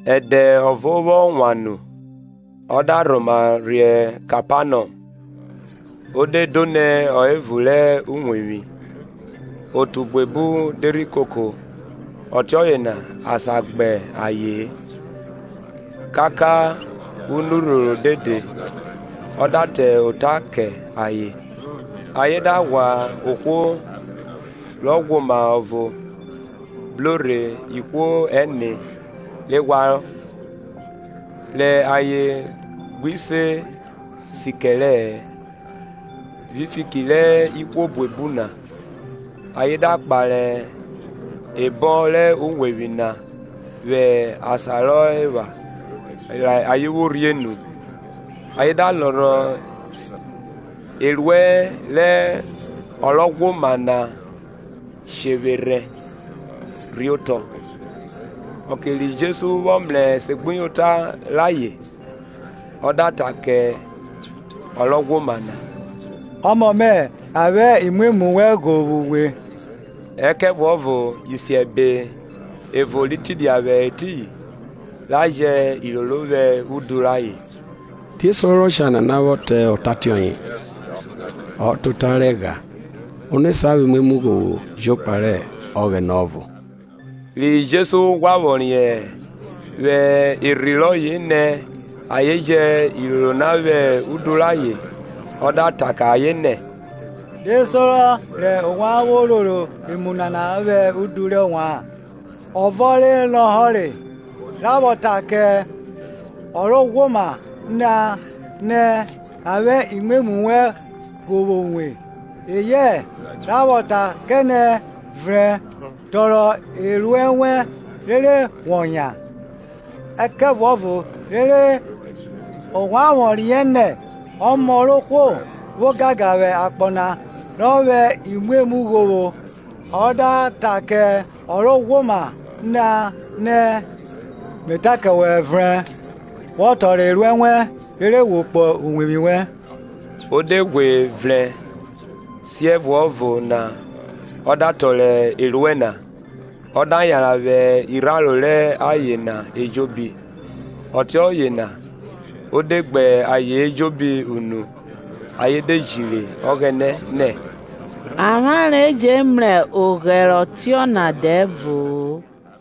Ẹdẹ evọ vwọ wan nu ọ da rhoma rhe Kẹpanọm, o de do nẹ ọ hẹ evun rẹ uwevwi. Otu buebu de rhi koko ọtiọye na asan gbe gba aye-en; kaka anurhoro dede; ọ da ta ota kẹ ayen. Ayen da ghwa ohwo ro ghwoma ọvo bro rhe ihwo ẹne re ghwarọ. Rẹ ayen gbi se sikẹrẹ-ẹ vwi fiki rẹ ihwo buebu na, ayen da kpare ebọn rẹ uwevwi na vwẹ asan rọ epha rẹ ayen vwo rhie nu, ayen da lọrọ eruẹ rẹ ọ ro ghwoma na shevwerhẹ rhe otọ. Ọke ri Jesu vwọ mrẹ esegbuyota rayen, ọ da ta kẹ ọ ro ghwoma na, Ọmọ mẹ, a vwẹ imwemwu wẹn ghovwo uwe. Ẹkẹvuọvo isiẹbe ẹvo ri tidia vwẹ etiyin, ra jẹ iroro vwẹ udu rayen, Die sorọ rẹ ọshare nana vwọ ta ota ọtiọye? Ọ ta ota rẹ ẹgha. Ono sa vwẹ imwemwu ghovwo jokpa rẹ Ọghẹnẹ ọvo? Ri Jesu ghwa vwọ riẹn vwẹ erhi rọye nẹ ayen jẹ iroro nana vwẹ udu rẹ ayen, Ọ da ta kẹ ayen nẹ, Die sorọ rẹ ovwan vwo roro emu nana vwẹ udu rẹ ovwan? Ọvo lọhọre, ra vwọ ta kẹ ọ ro ghwoma na nẹ, A vwẹ imwemwu wẹn ghovwo uwe; eyẹ, ra vwọ ta kẹ nẹ, Vrẹn, tọrọ eruẹ wẹn, rere wọ yan? Ẹkẹvuọvo rere ovwan vwọ riẹn nẹ Ọmọ rẹ ohwo vwo ogangan vwẹ akpọ na rọ vwẹ imwemwu ghovwo ọ da ta kẹ ọ ro ghwoma na nẹ– Me ta kẹ wẹ, vrẹn, wọ tọrọ eruẹ wẹn, rere wo kpo uwevwi wẹn. O de ghwe vrẹn, siẹvuọvo na ọ da tọrọ eruẹ na, ọ da yanran vwẹ irharo rẹ ayen na ejobi; ọtiọye na o de gbe ayen ejobi unu, ayen de jiri Ọghẹnẹ, nẹ, Avwanre jẹ mrẹ oghẹre tiọna dẹvo-o.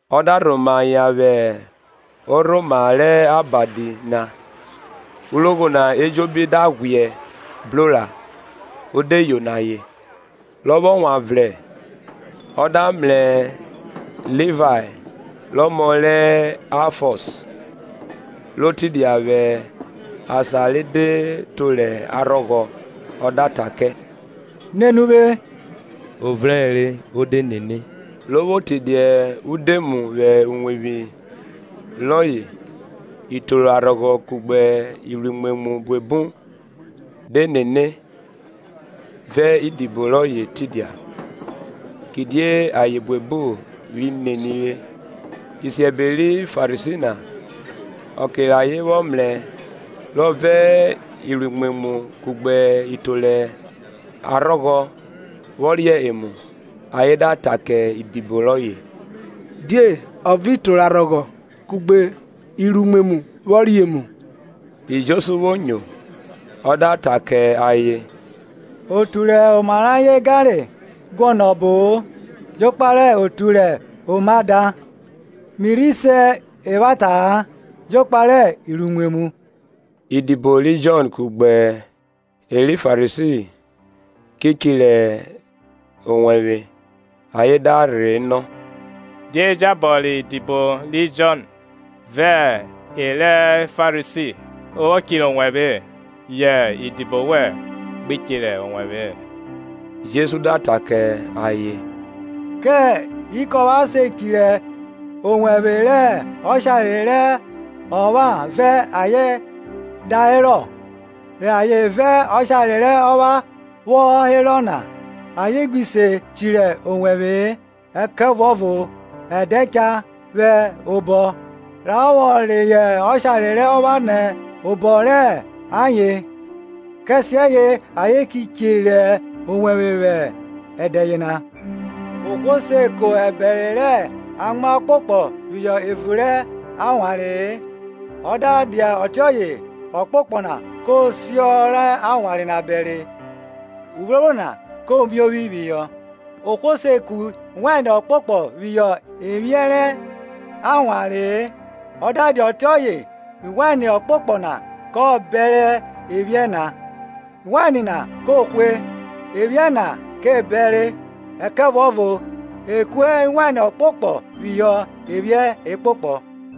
Ọ da rhoma yan vwẹ orhoma rẹ abadi na urogho na ejobi da ghwiẹ bro ra, o de yono ayen. Rọ vwọ wan vrẹn ọ da mrẹ Livae rẹ ọmọ rẹ Aifiọs ro tidia vwẹ asan re de toro arhọghọ, ọ da ta kẹ, Nene uvwe. O vrẹnre o de nene. Ro vwo tidia udoemu vwẹ uwevwi rọye itoro arhọghọ kugbe iruimwemwu buebu de nene vẹ idibo rọye tidia. kidie ayen buebu ri nenire. Isiẹbe ri Farisi na, ọke rẹ ayen vwọ mrẹ rọ vẹ iruimwemwu kugbe itoro arhọghọ vwo ria emu, ayen da ta kẹ idibo rọye, Die o vẹ itoro arhọghọ kugbe iruimwemwu vwọ ria emu? Ri Jesu vwo nyo, ọ da ta kẹ ayen, otu rẹ oma rẹ ayen ganre, guọnọ ọbo-o, jokpa rẹ otu rẹ oma da. mi rhi se evwata-a, jokpa rẹ iruimwemwu. Idibo ri Jọn kugbe e re Farisi ki chirẹ owẹvwe; ayen da rhe nọ, Die jabọ rẹ idibo ri Jọn vẹ e re Farisi vwo chirẹ owẹvwe yẹ idibo wẹn gbi chirẹ owẹvwe-e? Jesu da ta kẹ ayen, Kẹ ikọpha se chirẹ owẹvwe rẹ ọshare rẹ ọpha vẹ ayen da herọ? rẹ ayen vẹ ọshare rẹ ọpha vwọ herọ na, ayen gbi se chirẹ owẹvwe-e. Ẹkẹvuọvo ẹdẹ cha vwẹ obọ, ra vwọ reyọ ọshare rẹ ọpha nẹ obọ rẹ ayen, kẹsiẹye ayen ki che chirẹ owẹvwe vwẹ ẹdẹ yena. Ohwo se ko ẹbẹre rẹ amwa ọkpokpọ phihọ ewun rẹ awanre-e, ọ da dia ọtiọye ọkpokpọ na ko si ọ rẹ awanre na bẹre uphrophro na ko miovwi phihọ. Ohwo se ku wain ọkpokpọ phihọ ephiẹn rẹ awanree; ọ da dia ọtiọye wain ọkpokpọ na kọ bẹre ephiẹn na, wain na ko hwẹ, ephiẹn na ke bẹre; ẹkẹvuọvo e ku wain ọkpokpọ phihọ ephiẹn ekpokpọ.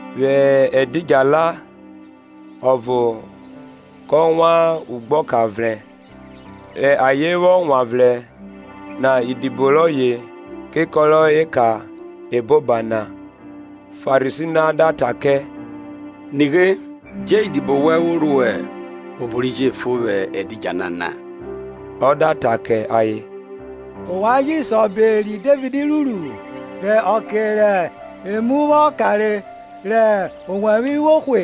Vwẹ ẹdidjala ọvo kọ wan ugbeka vrẹn, rẹ ayen vwọ wanvrẹn na idibo rọye ke kọrọ eka eboban na. Farisi na da ta kẹ, Nughe, die idibo wẹn vwo ruẹ obo ri jefo vwẹ ẹdidjala na? Ọ da ta kẹ ayen, Ovwan ji se obo ri Devid ruru-u, rẹ ọke rẹ emu vwọ kanrọ rẹ owẹvwe vwo hwe,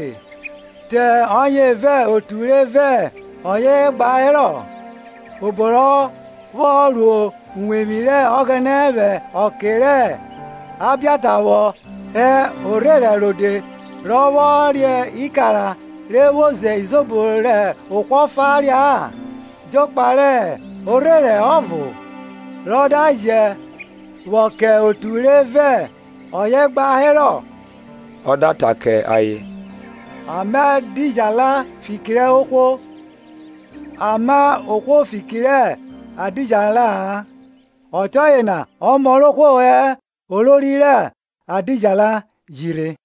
te ọye vẹ otu re vẹ ọye gba herọ; obo rọ vwọ ro uwevwi rẹ Ọghẹnẹ vwẹ ọke rẹ Abiata vwọ hẹ orherẹn rode rọ vwọ re ikara re vwo ze izobo rẹ ohwo ọfa ria-a jokpa rẹ orherẹn ọvo, rọ da je vwọ kẹ otu re vẹ ọye gba herọ? Ọ da ta kẹ ayen, A ma ẹdidjala fiki rẹ ohwo, a ma ohwo fiki rẹ edidjala-a. Ọtiọye na Ọmọ rẹ ohwo hẹ olori rẹ ẹdidjala ji rhe.